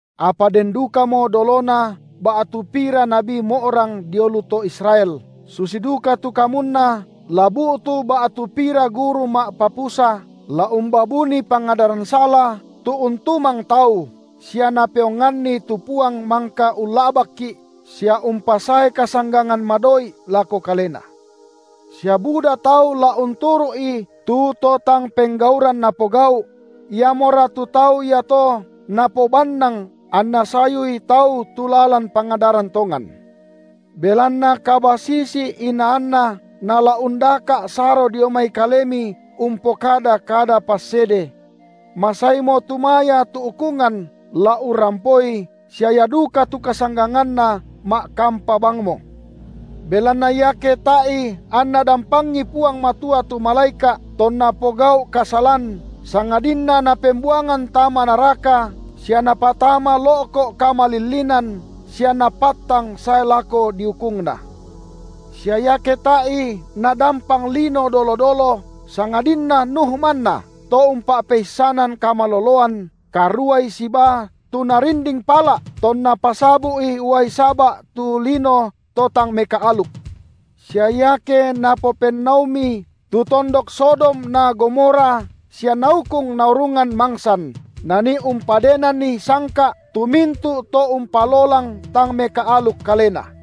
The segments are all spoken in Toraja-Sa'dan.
Apa den dukamo dolona ba’tu pira nabi mo’rang dio lu to Israel, susi duka tu kamunna la bu’tu ba’tu pira guru ma’papusa, la umbaa buni pangadaran sala, tu untumang tau, sia napeonganni tu Puang mangka ulla’bakki’, sia umpasae kasanggangan madoi’ lako kalena. Sia buda tau la unturu’i tu to tang penggauran napogau’; iamora tu tau iato napobannang anna sayui tau tu lalan pangadaran tongan. Belanna kabasisi-inaanna nala undaka’ saro dio mai kalemi umpokada kada passede. Masaimo tumaya tu ukungan la urrampoi sia ia duka tu kasangganganna ma’kampa bangmo. Belanna iake tae’i anNa dampangi Puang Matua tu malaeka’ tonna pogau’ kasalan, sangadinna Napembuangan tama naraka sia Napatama lo’ko’ kamalillinan sia Napattang sae lako diukungna, sia iake tae’i Nadampang lino dolo-dolo, sangadinna Nuh manna, to umpa’peissanan kamaloloan, karuai sibaa tu Narinding pala’, tonna pasabu’i uai saba’ tu lino to tang mekaaluk; sia iake Napopennaumi tu tondok Sodom na Gomora sia Naukung naurungan mangsan, Nanii umpadenanni sangka’ tu mintu’ to umpalolang tang mekaaluk kalena,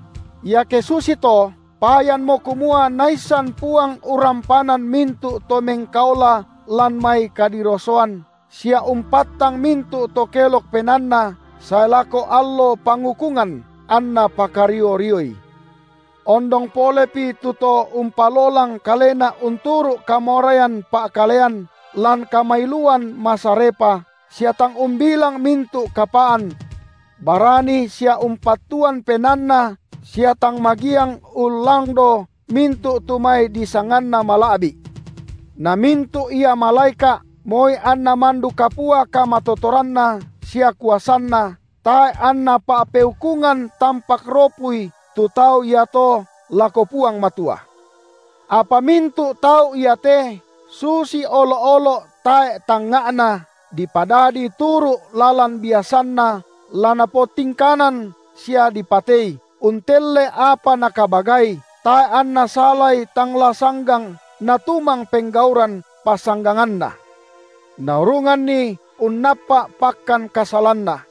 iake susito, payanmo kumua Naissan Puang urrampanan mintu’ to mengkaola lan mai kadirosoan, sia umpattang mintu’ to kelok penaanna sae lako allo pangukungan, anNa pakario-rioi, ondong polepi tu to umpalolang kalena unturu’ kamoraian pa’kalean lan kamailuan masarepa, sia tang umbilang mintu’ kapaan. Barani sia umpattuan penaanna sia tang magiang ullangdo mintu’ tu mai disanganna mala’bi’, na mintu’ ia malaeka’ moi anna mandu kapua kamatotoranna sia kuasanna tae’ anna pa’peukungan tampak ropui tu tau iato lako Puang Matua. Apa mintu’ tau iate, susi olo’-olo’ tae’ tangnga’na, dipadadi turu’ lalan biasanna la napotingkanan sia dipatei, untelle apa nakabagai; tae’ anna salai tang la sanggang natumang penggauran pasangganganna, naurunganni unnappa’ pakkan kasalanna.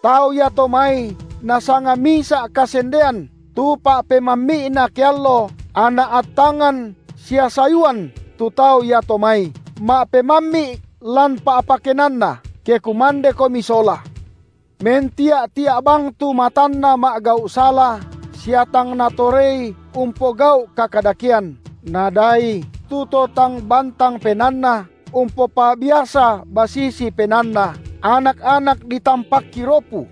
Tau iato mai nasanga misa’ kasendean tu pa’pemammi’na keallo, anna attangan sia sayuan tu tau iato mai, ma’pemammi’ lan pa’pakenanna, ke kumandekomi sola. Mentia’-tia’ bang tu matanna ma’gau’ sala sia tang natorei umpogau’ kakadakean, nadaai tu to tang bantang penaanna, umpopa’biasa basisi penaanna, anak-anak ditampakki ropu;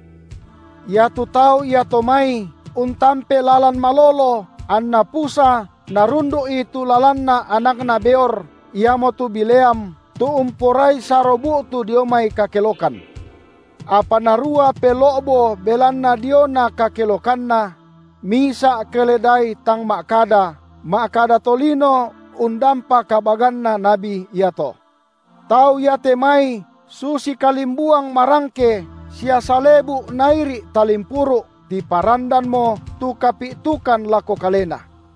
iatu tau iato mai untampe lalan malolo anna pusa narundu’i tu lalanna anakna Beor, iamotu Bileam, tu umporai saro bu’tu dio mai kakelokan, apa narua pelo’bo belanna diona kakelokanna; misa’ keledai tang ma’kada, ma’kada tolino undampa kabaganna nabi iato. Tau iate mai susi kalimbuang marangke sia salebu’ nairi’ talimpuru’, tiparandanmo tu kapi’tukan lako kalena.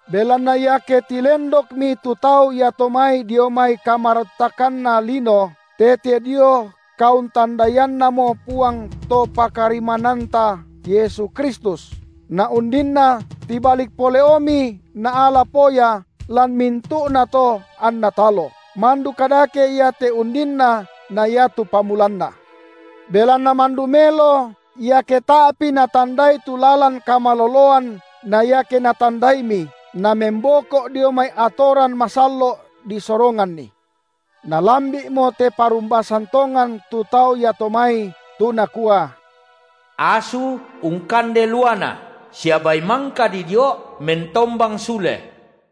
Belanna iake tilendokmi tu tau iato mai dio mai kamaruttakanna lino tete dio kauntandaiannamo Puang To pakarimmananta, Yesu Kristus, naundinna tibalik poleomi naala poya lan mintu’nato anna talo, mandu kadake ia te undinna na iatu pamulanna. Belanna mandu melo, iake tae’pi natandai tu lalan kamaloloan na iake natandaimi, namemboko’ dio mai atoran masallo’ disoronganni. Nalambi’mo te parumbasan tongan tu tau iato mai, tu nakua: Asu ungkande luana sia bai mangka didio’ mentombang sule.